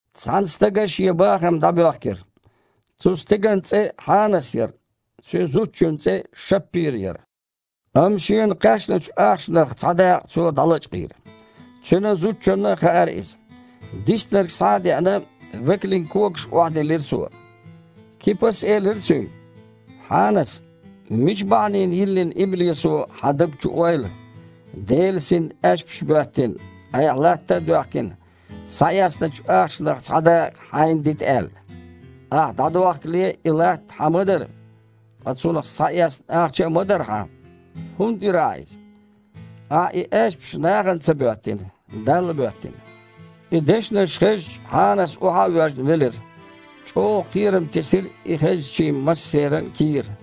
Цхьана стага шен бахам дІабоьхкира. Цу стеган цІе Хьанас яра, цуьнан зудчун цІе Шаппира яра, Амма шена кхаьчначу ахчанах цхьа дакъа цо дІалачкъийра. Цуьнан зудчунна а хаьара иза. Диснарг, схьа а деана, векалийн когашка охьадиллира цо. Кипас элира цуьнга: «Хьанас, мича бахьанина йиллина иблисо хьан даг чу ойла, Делан Синна аьшпаш а боьттина, айхьа, латта а доьхкина, схьаэцначу ахчанах цхьа дакъа хьайна дита аьлла? Ахьа дІадохкале а и латта хьан ма дара, ткъа цунах схьаэцна ахча а ма дара хьан. ХІунда дира ахьа иза? Ахьа и аьшпаш нахана ца боьттина, Далла боьттина». И дешнаш хезча, Хьанас, охьа а воьжна, велира. ЧІогІа кхерам тесира и хезначийн массеран а кийра.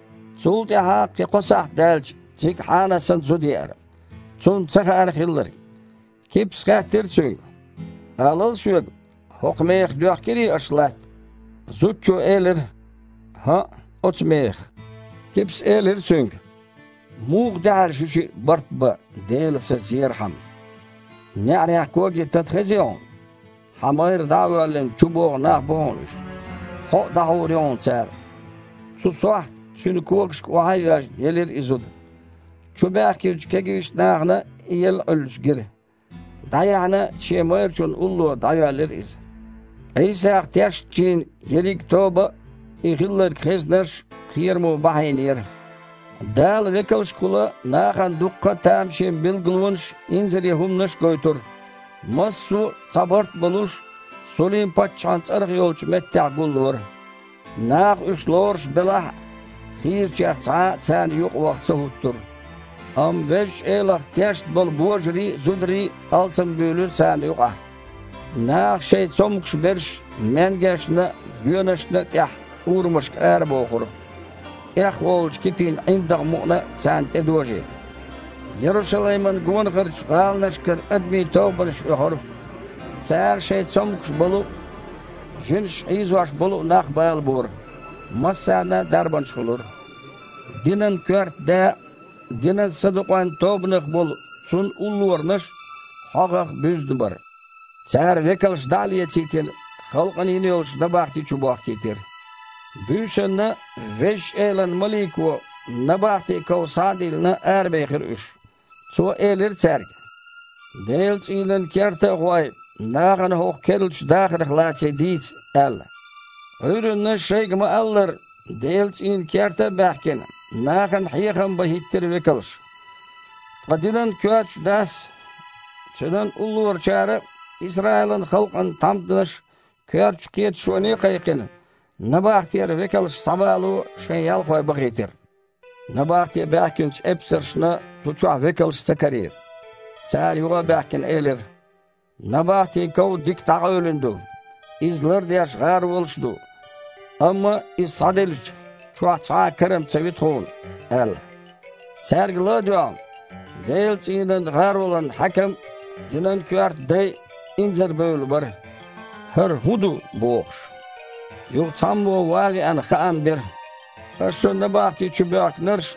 Цул тІаьхьа, кхин кхо сахьт даьлча, цига Хьанасан зуда еара. Цунна ца хаьара хилларг. Кипас хаьттира цуьнга: «Алал соьга, хІокху мехах доьхкирий аша латта?» Зудчо элира: «ХІаъ, оцу мехах». Кипас элира цуьнга: «Муха даьхьира шуьшиъ бартбан Делан Са зерхьама? НеІарехь когийн тата хезий хьуна? Хьан майра дІа а воьллина, чубогІу нах бу хьуна уьш. Хьо а дІахьур ю хьуна цара». Цу сохьта, цуьнан когашка охьа а йоьжна, елира и зуда. Чубаьхкинчу кегийчу нахана и елла Іуьллуш гира. ДІаяьхьна, шен майрачунна улло дІайоьллира иза. Іийсах тешначийн ерриг тоба а, и хилларг хезнарш а кхерамо бахьийнера. Дала векалшкахула нахана дуккха а тамашийна билгалонаш а, инзаре хІуманаш а гойтура. Массо а, цхьа барт а болуш, Сулим-паччахьан цІарах йолчу меттехь гуллора. Наха уьш лоруш белахь а, хийрачех цхьа а царна юкъа ваха ца хІуттура. Амма Везачу Элах тешна болу божарий а, зударий а алсамбуьйлура царна юкъахь. Наха шайн цомгуш берш маьнгешна а, гоьнашна а тІехь урамашка арабохура, тІехволучу Кипин ІиндагІ мукъана а царна тІедожийта. Ярушалаймана гонахарчу гІаланашкара адамийн тобанаш оьхура. Цара шайн цомгуш болу а, жинаша хьийзош болу а нах балабора. Массарна а дарбанаш хуьлура. Динан коьрта да а, динан садукъойн тобанах болу цунна уллоранаш а хьогІах буьзна бара. Цара векалш, дІа а лецийтина, халкъана йина йолчу набахти чу бохкийтира. Буьйсанна Везачу Элан малико, набахтин ков схьа а диллина, арабехира уьш. Цо элира цаьрга: «Делан цІийнан керта а гІой, нахана хІокху керлачу дахарх лаций дийца», – аьлла. Іуьйранна, шайга ма-аллара, Делан цІийнан керта а баьхкина, нахана хьехам бан хІиттира векалш. Ткъа динан коьртачу дас а, цуьнан уллорачара а Исраилан халкъан тхьамданаш коьртачу кхеташоне а кхайкхина, набахтера векалш схьабало шайн ялхой бахийтира. Набахте баьхкинчу эпсаршна цу чохь векалш ца карийра. Цара, юха а баьхкина, элира: «Набахтин ков дика дІакъевлина ду, иза лардеш гІаролаш а ду, амма иза схьадиллича, чохь цхьа а кара-м ца ви тхуна», – аьлла. Цаьрга ла а доьгІна, Делан цІийнан гІаролан хьаькам а, динан коьрта дай а инзарабевлла бара, «ХІара хІун ду?» – бохуш. Юха цхьаммо, ван а веана, хаам бира: «Аша набахти чу боьхкинарш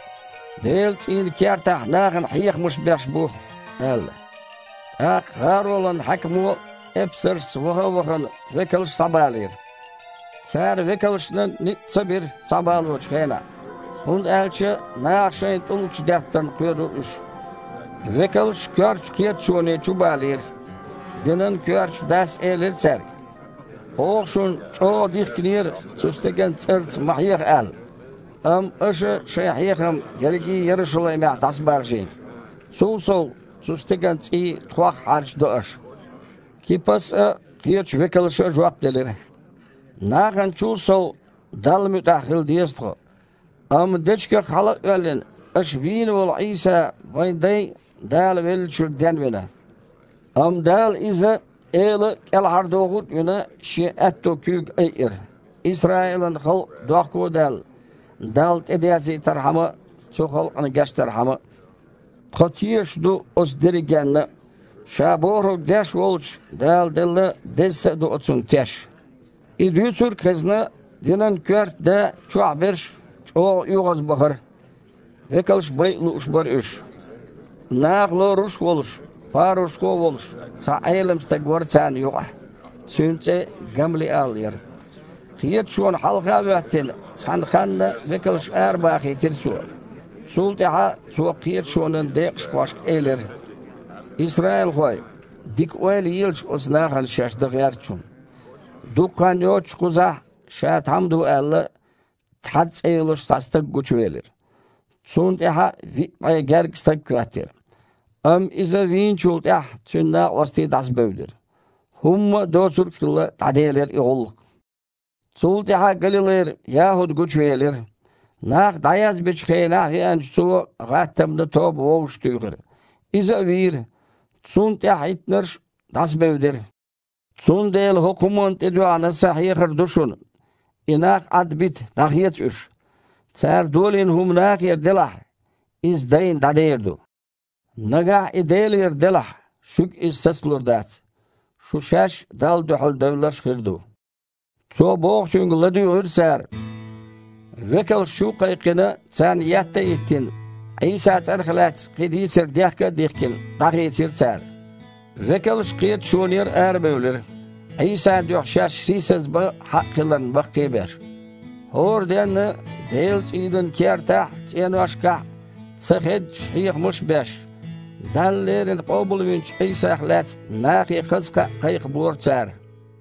Делан цІийнан кертахь нахана хьехамаш беш бу», – аьлла. ТІаккха гІаролан хьаькамо, эпсаршца ваха а вахана, векалш схьабалийра. Цара векалшна ницкъ ца бира схьабалочу хенахь, хІунда аьлча наха шайна тІулгаш деттарна кхоьрура уьш. Векалш коьртачу кхеташоне чубалийра. Динан коьртачу дас элира цаьрга: «Оха шуна чІогІа дихкинера, цу стеган цІарца ма хьеха аьлла, амма аша шайн хьехам ерриге а Ярушалаймехь дІасабаржийна. Цул сов, цу стеган цІий тхох хьарчадо аша». Кипас а, кхечу векалша а жоп делира: «Наханачул а сов Далла муьтІахь хила деза тхо! Амма дечигах хьала а оьллина, аша вийна волу Іийса вайн дайн а Дала веллачуьра денвина. Амма Дала Иза, Эла а, кІелхьардохург а вина, Шен аьтту куьйга айира, Исраилан халкъ, дохко а даьлла, Далла тІедерзийтархьама а, цу халкъана гечдархьама а. Тхо тешаш ду оцу дерригенна а. Ша бохург деш волчунна Дала делла Деза Са а ду оцунна теш». И дуьйцург а хезна, динан коьрта да а, чохь берш а чІогІа оьгІазбахара. Векалш байа лууш бара уьш. Наха лоруш а волуш, парушхо а волуш, цхьа Іелам стаг вара царна юкъахь. Цуьнан цІе Гамлиал яра. Кхеташона хьалха а хІоьттина, цхьана ханна векалш арабахийтира цо. Цул тІаьхьа цо кхеташонан декъахошка элира: «Исраилхой, дика ойла елаш оцу нахана шаьш дан гІертачун. Дукха хан йоццуш кхузахь, ша тхьамда ву аьлла, Тхьада цІе йолуш цхьа стаг гучувелира. Цунна тІаьхьа виъ бІе гергга стаг хІоьттира. Амма иза вийначул тІаьхьа, цуьнан накъостий дІасабевдира. ХІумма а доцург а хилла, дІаделира и гІуллакх. Цул тІаьхьа Галилайра Яхьуд гучувелира. Нах дІаязбечу хенахь веанчу цо гІаттамана тоба вовшахтуьйхира. Иза а вийра, цунна тІаьхьахІиттинарш а дІасабевдира. Цундела хІокху хІуманна тІедоьгІна сан хьехар ду шуна: и нах Іадбита, дІахеца уьш. Цара долийна хІума нахера делахь, иза, дайна, дІадер ду. Нагахь и Делера делахь, шуьга иза сацалур дац. Шу шаьш а Далла дуьхьал девлларш хир ду». Цо бохучуьнга ладуьйгІира цара. Векалш, чу а кхайкхина, царна етта а йиттина, Іийсан цІарах лаьцна кхин дийцар дехка а дихкина, дІахийцира цара. Векалш кхеташонера арабевлира, Іийсан дуьхьа шаьш сийсазбан хьакъ хиларна баккхий а беш. ХІора денна Делан цІийнан кертахь а, цІеношкахь а ца хеддаш хьехамаш а беш, Дала леррина къобалвинчу Іийсах лаьцна нахе хаза кхаъ кхайкхабора цара.